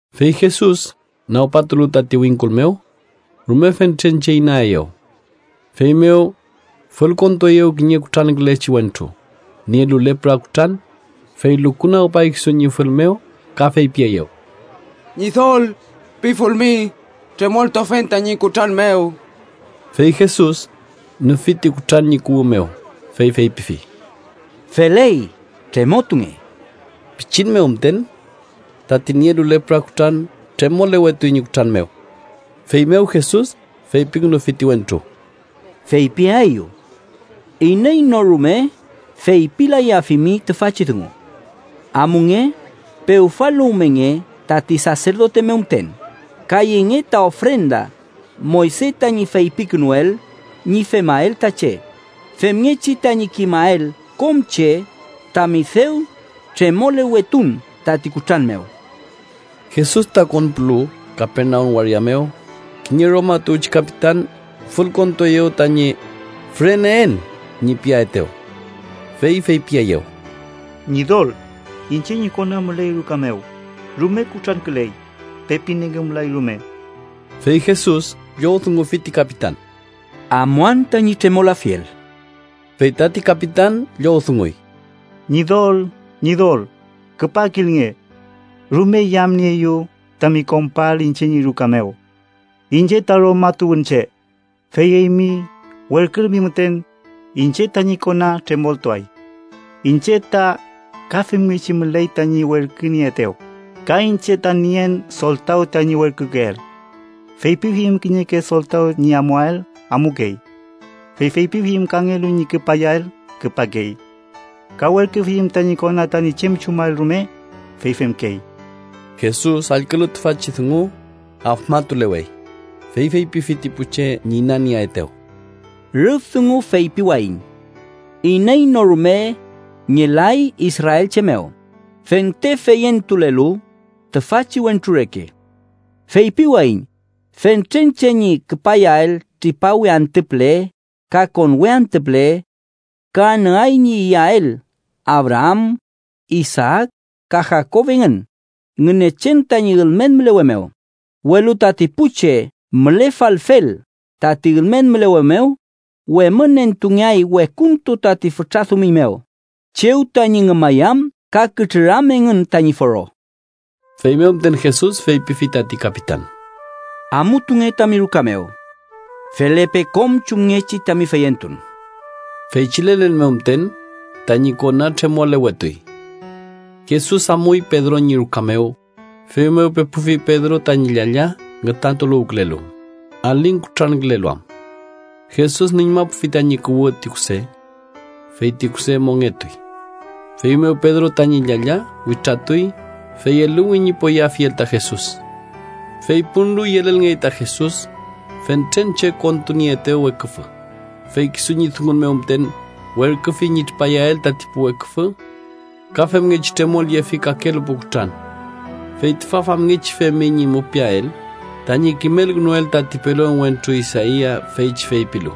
Fey Jesus nagpatulu tati wingkul mew, rume fentren che inaeyew. Feymew fülkontueyew kiñe kutrankülechi wentru nielu lepra kutran, fey lukunagpay kisu ñi fül mew ka feypieyew: —Ñidol, pifulmi, tremoltuafen tañi kutran mew. Fey Jesus nüfi ti kutran ñi kuwü mew, fey feypifi: —Feley. ¡Tremotunge! Pichin mew müten, tati niekelu lepra kutran tremolewetuy ñi kutran mew. Feymew Jesus feypikünufi ti wentru: —Feypiaeyu, iney no rume feypilayafimi tüfachi dungu. Amunge, pewfaluwmenge tati saserdote mew müten, ka yenge ta ofrenda Moyse tañi feypikünuel ñi femael ta che, femngechi tañi kimael kom che tami dew tremolewetun tati kutran mew. Jesus ta konpulu Kapernaum waria mew, kiñe Roma tuwchi kapitan fülkontueyew tañi “füreneen” ñi piaetew. Fey feypieyew: —Ñidol, iñche ñi kona müley ruka mew, rume kutranküley, pepi nengümlay rume. Fey Jesus llowdungufi ti kapitan: —Amuan tañi tremolafiel. Fey tati kapitan llowdunguy: —Ñidol, Ñidol, küpakilnge. Rume yamnieeyu tami konpuael iñche ñi ruka mew. Iñche ta Roma tuwünche. Fey eymi werkülmi müten, iñche tañi kona tremoltuay. Iñche ta ka femngechi müley tañi werkünieetew, ka iñche ta nien soltaw tañi werkükeel. Feypifiyüm kiñeke soltaw ñi amuael, amukey. Fey feypifiyüm kangelu ñi küpayael, küpakey. Ka werküfiyüm tañi kona tañi chem chumael rume, fey femkey. Jesus allkülu tüfachi dungu afmatulewey, fey feypifi ti pu che ñi inanieetew: —Rüf dungu feypiwayiñ iney no rume ngelay israelche mew fente feyentulelu tüfachi wentru reke. Feypiwayiñ fentren che ñi küpayael tripawe antü püle ka konwe antü püle, ka anüay ñi iyael Abraam, Isaak ka Jakob engün Ngünechen tañi ülmen mülewe mew, welu tati pu che mülefalfel tati ülmen mülewe mew, wemünentungeay wekuntu tati fütra dumiñ mew, chew tañi ngümayam ka kütrüram engün tañi foro. Feymew müten Jesus feypifi tati kapitan: —Amutunge tami ruka mew. Felepe kom chumngechi tami feyentun. Feychi lelen mew müten tañi kona tremolewetuy. Jesus amuy Pedro ñi ruka mew, feymew pepufi Pedro tañi llalla ngütantuluwkülelu, aling kutrankülelu am. Jesus nüñmapufi tañi kuwü ti kuse, fey ti kuse mongetuy. Feymew Pedro tañi llalla witratuy, fey eluwi ñi poyeafiel ta Jesus. Fey punlu, yelelngey ta Jesus fentren che kontunieetew weküfü, fey kisu ñi dungun mew müten werküfi ñi tripayael tati pu weküfü. Ka femngechi tremolyefi kakelu pu kutran. Fey tüfa famngechi femi ñi mupiael tañi kimelkünuel tati pelon wentru Isaia, feychi feypilu: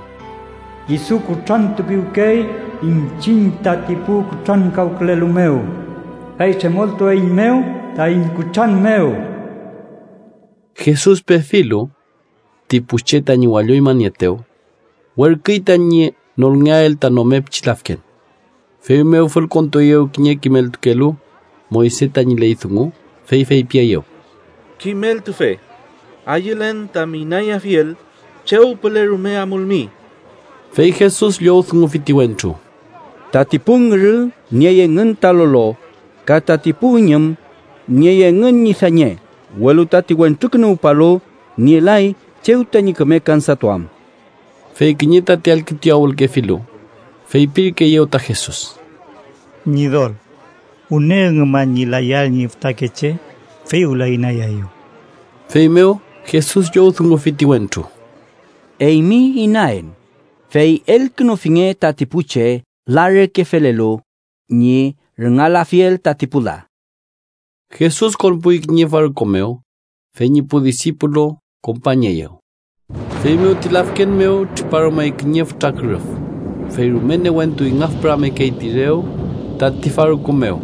“Kisu kutrantupiwkey iñchiñ tati pu kutrankawkülelu mew, fey tremoltueiñmew taiñ kutran mew.” Jesus pefilu ti pu che tañi walloñmanieetew, werküy tañi nolngeael ta nome pichi lafken. Feymew fülkontueyew kiñe kimeltukelu Moyse tañi ley dungu, fey feypieyew: —Kimeltufe, ayülen tami inayafiel chew püle rume amulmi. Fey Jesus llowdungufi ti wentru: —Tati pu ngürü niey engün ta lolo ka tati pu üñüm niey engün ñi dañe, welu tati Wentrukünuwpalu nielay chew tañi küme kansatuam. Fey kiñe tati allkütuyawülkefilu, feypirkeeyew ta Jesus: —Ñidol, wüne üngüman ñi layael ñi fütakeche, fey wüla inayaeyu. Feymew Jesus llowdungufi ti wentru: —Eymi inaen, fey elkünufinge tati pu che la reke felelu ñi rüngalafiel tati pu la. Jesus konpuy kiñe farku mew, fey ñi pu disipulu kompañeyew. Feymew ti lafken mew triparumey kiñe fütra kürüf, fey rume newentu ingafpüramekey ti rew tati farku mew,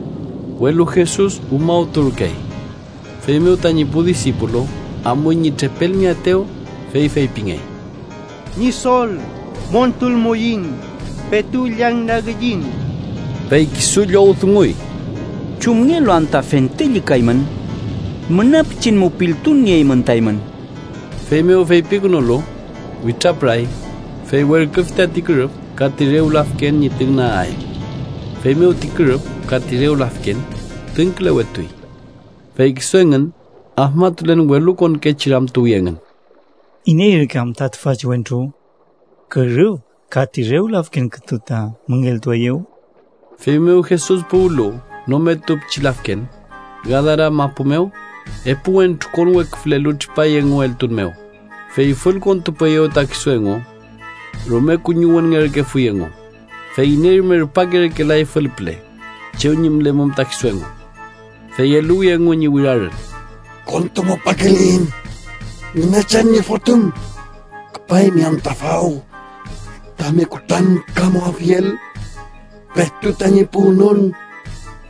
welu Jesus umawturkey. Feymew tañi pu disipulu amuy ñi trepelmeaetew, fey feypimengey: —¡Ñidol, montulmuiñ! ¡Petu llañnagiyiñ! Fey kisu llowdunguy: —¿Chumngelu anta fente llükaymün? ¡Müna pichin mupiltun nieymün ta eymün! Feymew feypikünulu, witrapüray, fey werküfi tati kürüf ka ti rew lafken ñi tüngnagael. Feymew ti kürüf ka ti rew lafken tüngkülewetuy. Fey kisu engün, afmatulen welukonkechi ramtuwi engün: “¿Iney ürke am tüfachi wentru, kürüf ka ti rew lafken kütu ta müngeltueyew?” Feymew Jesus puwlu nometu pichi lafken, Gadara mapu mew, epu wentru konweküfülelu tripay engu eltun mew, fey fülkontupueyew ta kisu engu. Rume kuñiwünngerkefuy engu, fey iney rume rupakerkelay fülpüle chew ñi mülemum ta kisu engu. Fey eluwi engu ñi wirarün: —¡Kontumupakeliyiñ, Ngünechen ñi Fotüm! ¿Küpaymi anta faw tami kutrankamuafiel petu tañi puwnon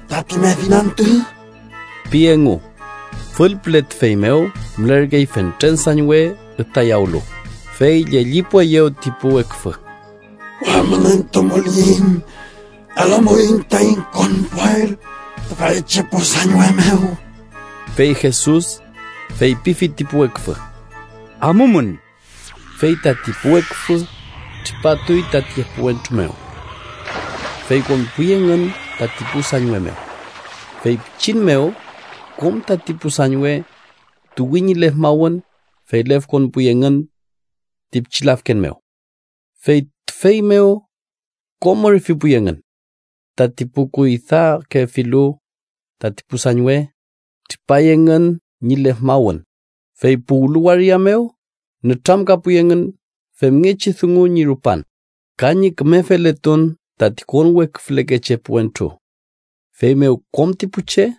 tati medin antü? ―pi engu. Fülpüle tüfey mew mülerkey fentren sañwe ütayawlu, fey llellipueyew ti pu weküfü: —Wemünentumuliyiñ, elumuiñ taiñ konpuael tüfeychi pu sañwe mew. Fey Jesus feypifi ti pu weküfü: —Amumün. Fey tati pu weküfü tripatuy tati epu wentru mew, fey konpuy engün tati pu sañwe mew. Fey pichin mew kom tati pu sañwe tuwi ñi lefmawün, fey lefkonpuy engün ti pichi lafken mew. Fey tüfey mew kom ürfipuy engün. Tati pu kuydakefilu tati pu sañwe, tripay engün ñi lefmawün, fey puwlu waria mew nütramkapuy engün femngechi dungu ñi rupan, ka ñi küme feletun tati konweküfülekechi epu wentru. Feymew kom ti pu che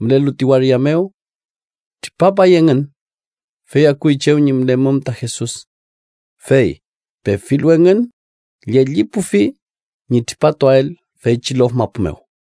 mülelu ti waria mew tripapay engün, fey akuy chew ñi mülemum ta Jesus. Fey pefilu engün, llellipufi ñi tripatuael feychi lof mapu mew.